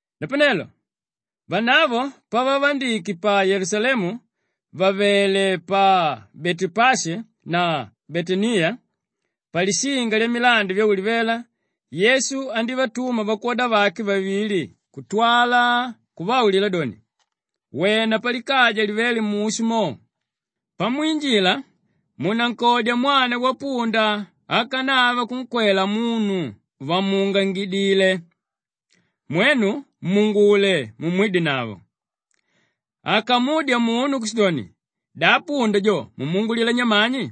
Napanelo vanavo pavavandike pa Yelusalemu vàvele pa Betepashi na Betaniya, palishinga lyamilandi Vyaulivela Yesu andívatuma vakwoda vake vavili kutwala kuvaulila doni, “Wena palikaja livéle mushu mo. Pamwinjila munankodya mwana wapunda ákanava kunkwela munu vamuungangidile. Mwenu muungule mumwidenavo. Akamudya munu kushidoni, ‘Da punda jo mumuungulila nyamani?’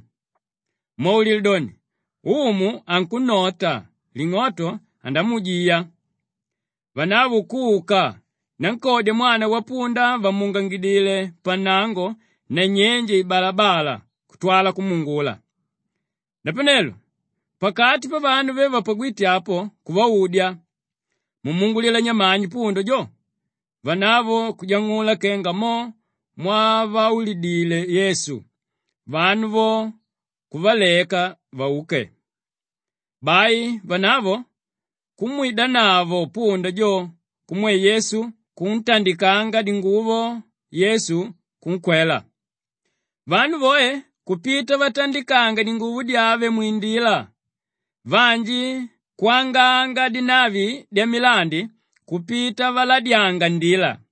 Mwaulile doni, ‘Umu ankunnota, ling'oto andamuujiya.’” Vanavo kuka nankodya mwana wapunda vamuungangidile pannango nanyenje ibalabala kutwala kumuungula. Napanelo pakati pavanu ve vapagwíte apo kuvaudya, “Mumuungulila nyamani punda jo?” Vanavo kuvajang'ula kenga mo mwavaulidile Yesu, vanu vo kuvaleka vauke. Bai vanavo kumwidanavo punda jo kumwe Yesu kuntandikanga dinguvo, Yesu kunkwela. Vanu voe kupita vatandikanga dinguvo dyave mwindila, vanji kwanganga dinavi dyamilandi kupita valadyanga ndila.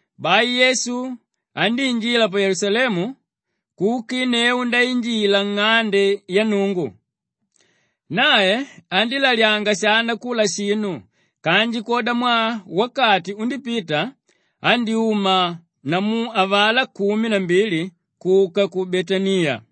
Bai Yesu andíinjila pa Yelusalemu kukinneu ndainjila nng'ande ya Nnungu. Nae andílalyanga shana kula shinu kanji kwodamwaa wakati undípita andyúma namu avalá kumi na mbili kuka ku Betaniya.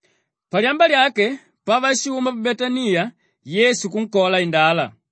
Palyamba lyake pavashuma pa Betaniya Yesu kunkola indala.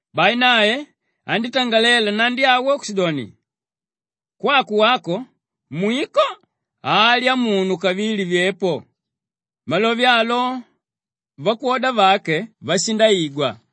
Bai nae andítangalela nnandi awo kushidoni, “Kwako wako mwiko, halya munu kavili vyepo.” Malove alo, vakwoda vake vashindaigwa.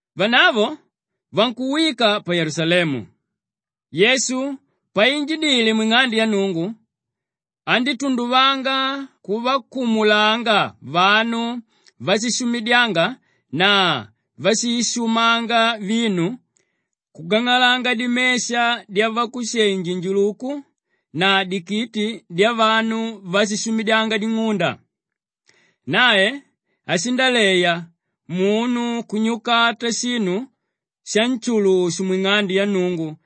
Vanavo vankuwika pa Yelusalemu. Yesu painjidile mwing'ande ya Nnungu andítunduvanga kuvakumulanga vanu váshishumidyanga na váshishumanga vinu, kugang'alanga dimesha dyavakushenji-njuluku na dikiti dyavanu váshishumidyanga ding'unda. Nae ashindaleya munu kunyukata shinu shanshulushu mwing'ande ya Nnungu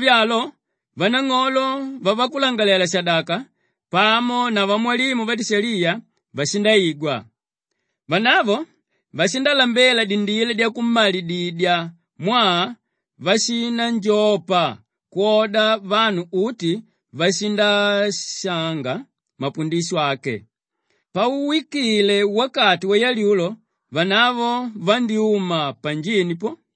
Malove alo, vanang'olo vavakulangalalela-shadaka pamo na vamwalimu vadishaliya vashindaigwa. Vanavo vashindalambela dindila dyakummalididya mwaa vashinanjopa kwoda vanu uti vashindashanga mapundisho ake. Pauwikile wakati wayalyulo vanavo vandyúma panjini po.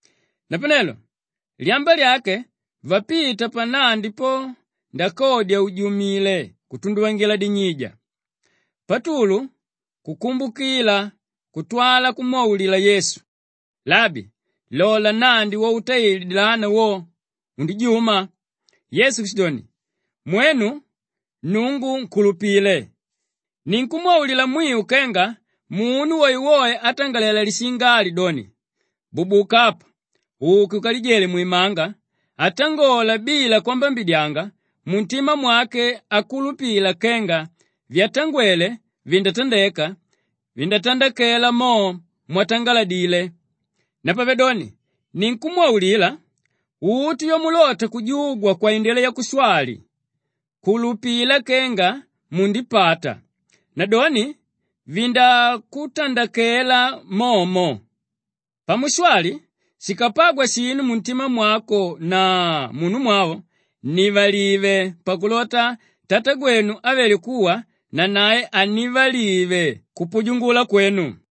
Napanelo lyamba lyake vapita pannandi po ndakodya ujumile kutunduvangila dinyija. Patulu kukumbukila kutwala kumwaulila Yesu, “Labi, lola nnandi wautaile dilana wo, undijuma.” Yesu kushidoni, “Mwenu, Nnungu nkulupile. Ninkumwaulila mwiu kenga munu woewoe átangalela lishinga ali doni, ‘Bubuka apa uke ukalijele mwimanga,’ atangola bila kwambambidyanga muntima mwake, akulupila kenga vyatangwele vindátandeka, vindatandakela mo mwatangaladile. Napavedoni ninkumwaulila, uti vyamulota kujugwa kwaindila yakushwali kulupila kenga mundipata nadoni vindakutandakela momo. Pamushwali, shikapagwa shinu muntima mwako na munumwavo, nnivalive pakulota Tatagwenu ávele kuwa nanae annivalive kupujungula kwenu.”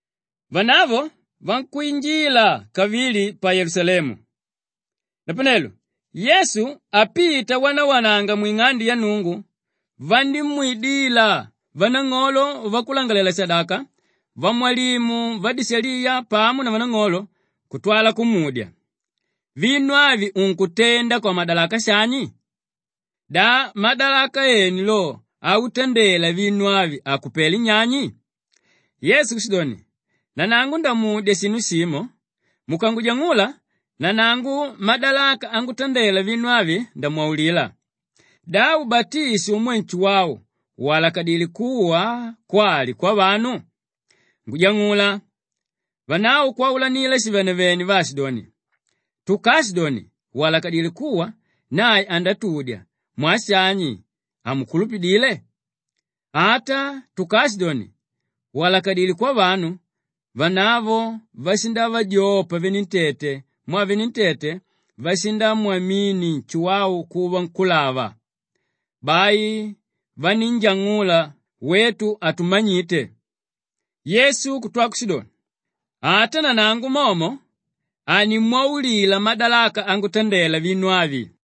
Vanavo vankwinjila kavili pa Yelusalemu. Napanelo Yesu apita awanawananga mwing'ande ya Nnungu, vandímwidila vanang'olo vavakulangalalela-shadaka, vamwalimu vadishaliya pamo na vanang'olo kutwala kumudya, “Vinu avi unkutenda kwamadalaka shani? Da madalaka ene lo autandela vinu avi akupelé nyani?” Yesu kushidoni, “Nanangu ndamudya shinu shimo mukangujang'ula, nanangu madalaka angutandela vinu avi, ndamwaulila. Da ubatisho umwe Nshuwau walakadilé kuwa kwali kwavanu? Ngujang'ula!” Vanavo kwaulanila shivenevene vaashidoni, “Tukaashidoni, ‘Walakadilé kuwa,’ nae andatudya, ‘Mwaa shani hamunkulupidile?’ Ata tukaashidoni, ‘Walakadilé kwavanu…’” Vanavo vashindavajopa venentete mwaa venentete vashindamwamini Nshuwau kuva nkúlava. Bai vanínjang'ula, “Wetu hatumanyite.” Yesu kutwa kushidoni, “Ata nanangu momo hanimwaulila madalaka angutandela vinu avi.”